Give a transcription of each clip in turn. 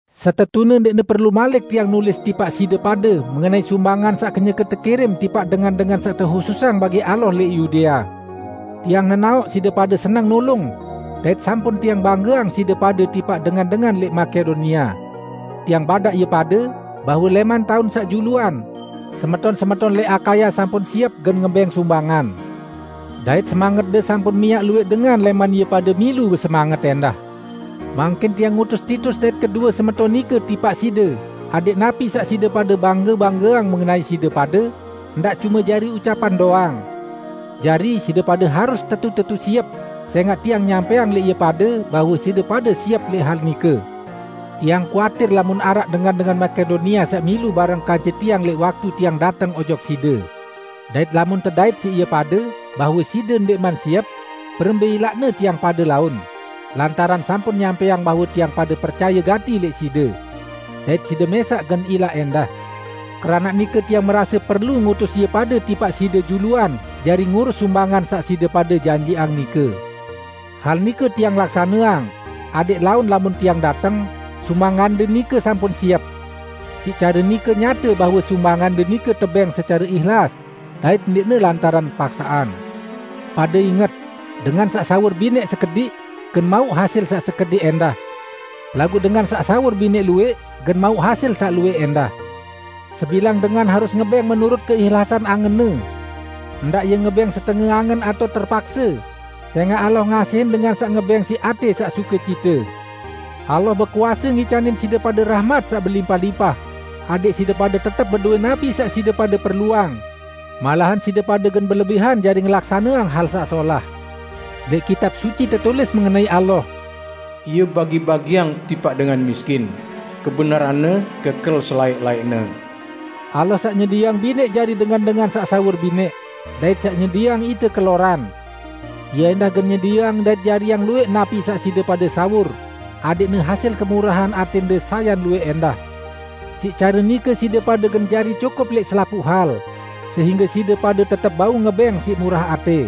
Setetune ndẽqne perlu malik tiang nulis tipaq side pade mengenai sumbangan saq kenyeke tekirim tipaq dengan-dengan saq tehususang bagi Allah lẽq Yudea. Tiang nenaoq side pade seneng nulung, dait sampun tiang banggeang side pade tipaq dengan-dengan lẽq Makedonia. Tiang badaq ie pade, bahwe lẽman taun saq juluan, semeton-semeton lẽq Akaya sampun siep gen ngebẽng sumbangan. Dait semangetde sampun miaq luwẽq dengan lẽman ie pade milu besemanget ẽndah. Mangkin tiang ngutus Titus dait kedue semeton nike tipaq side adẽq napi saq tiang pade bangge-banggeang mengenai side pade ndaq cume jari ucapan doang. Jari, side pade harus tetu-tetu siep, sẽngaq tiang nyampẽang lẽq ie pade bahwe side pade siep lẽq hal nike. Tiang kuatir lamun araq dengan-dengan Makedonia saq milu bareng kance tiang lẽq waktu tiang dateng ojok side. Dait lamun tedait siq ie pade bahwe side ndẽqman siep, berembẽ ilaqne tiang pade laun, lantaran sampun nyampẽang bahwe tiang pade percaye gati lẽq side! Dait side mẽsaq gen ilaq ẽndah. Keranaq nike tiang merase perlu ngutus ie pade tipaq side juluan jari ngurus sumbangan saq side pade janjiqang nike. Hal nike tiang laksaneang, adẽq laun lamun tiang dateng, sumbangande nike sampun siep. Siq care nike, nyate bahwe sumbangande nike tebẽng secare ihlas, dait ndẽqne lantaran paksaqan. Pade inget! Dengan saq sawur binẽq sekediq, gen mauq hasil saq sekediq ẽndah. Laguq dengan saq sawur binẽq luwẽq, gen mauq hasil saq luwẽq ẽndah. Sebilang dengan harus ngebẽng menurut keihlasan angenne. Ndaq ie ngebẽng setenge angen atao terpakse, sẽngaq Allah ngasihin dengan saq ngebẽng siq atẽ saq sukecite. Allah bekuase ngicanin side pade rahmat saq belimpah-limpah, adẽq side pade tetep bedowẽ napi saq side pade perluang; malahan side pade gen belebihan jari ngelaksaneang hal saq solah. Lẽq Kitab Suci tetulis mengenai Allah, "Ie bagi-bagiang tipaq dengan miskin; kebenaran-Ne kekel selaẽq-laẽqne." Allah saq nyedieang binẽq jari dengan-dengan saq sawur binẽq, dait saq nyedieang ite keloran. Ie ẽndah gen nyedieang dait jariang luwẽq napi saq side pade sawur, adẽqne hasil kemurahan atẽnde sayan luwẽq ẽndah. Siq care nike side pade gen jari cukup lẽq selapuq hal, sehingge side pade tetep bau ngebẽng siq murah atẽ.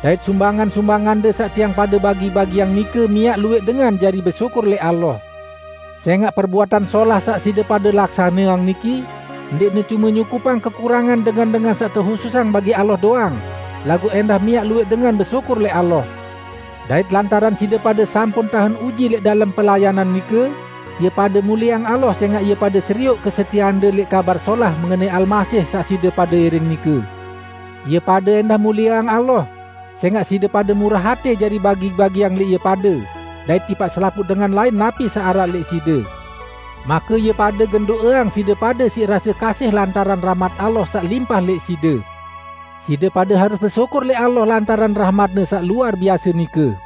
Dait sumbangan-sumbangande saq tiang pade bagi-bagiang nike miaq luwẽq dengan jari besyukur lẽq Allah. Sẽngaq perbuatan solah saq side pade laksaneang niki ndẽqne cume nyukupang kekurangan dengan-dengan saq tehususang bagi Allah doang, laguq ẽndah miaq luwẽq dengan besyukur lẽq Allah. Dait lantaran side pade sampun tahen uji lẽq dalem pelayanan nike, ie pade mulieang Allah sẽngaq ie pade serioq kesetieande lẽq Kabar Solah mengenai Almasih saq side pade iring nike. Ie pade ẽndah mulieang Allah, sẽngaq side pade murah atẽ jari bagi-bagiang lẽq ie pade, dait tipaq selapuq dengan lain napi saq araq lẽq side. Make ie pade gen do'eang side pade siq rase kasih lantaran rahmat Allah saq limpah lẽq side. Side pade harus besyukur lẽq Allah lantaran rahmat-Ne saq luar biase nike!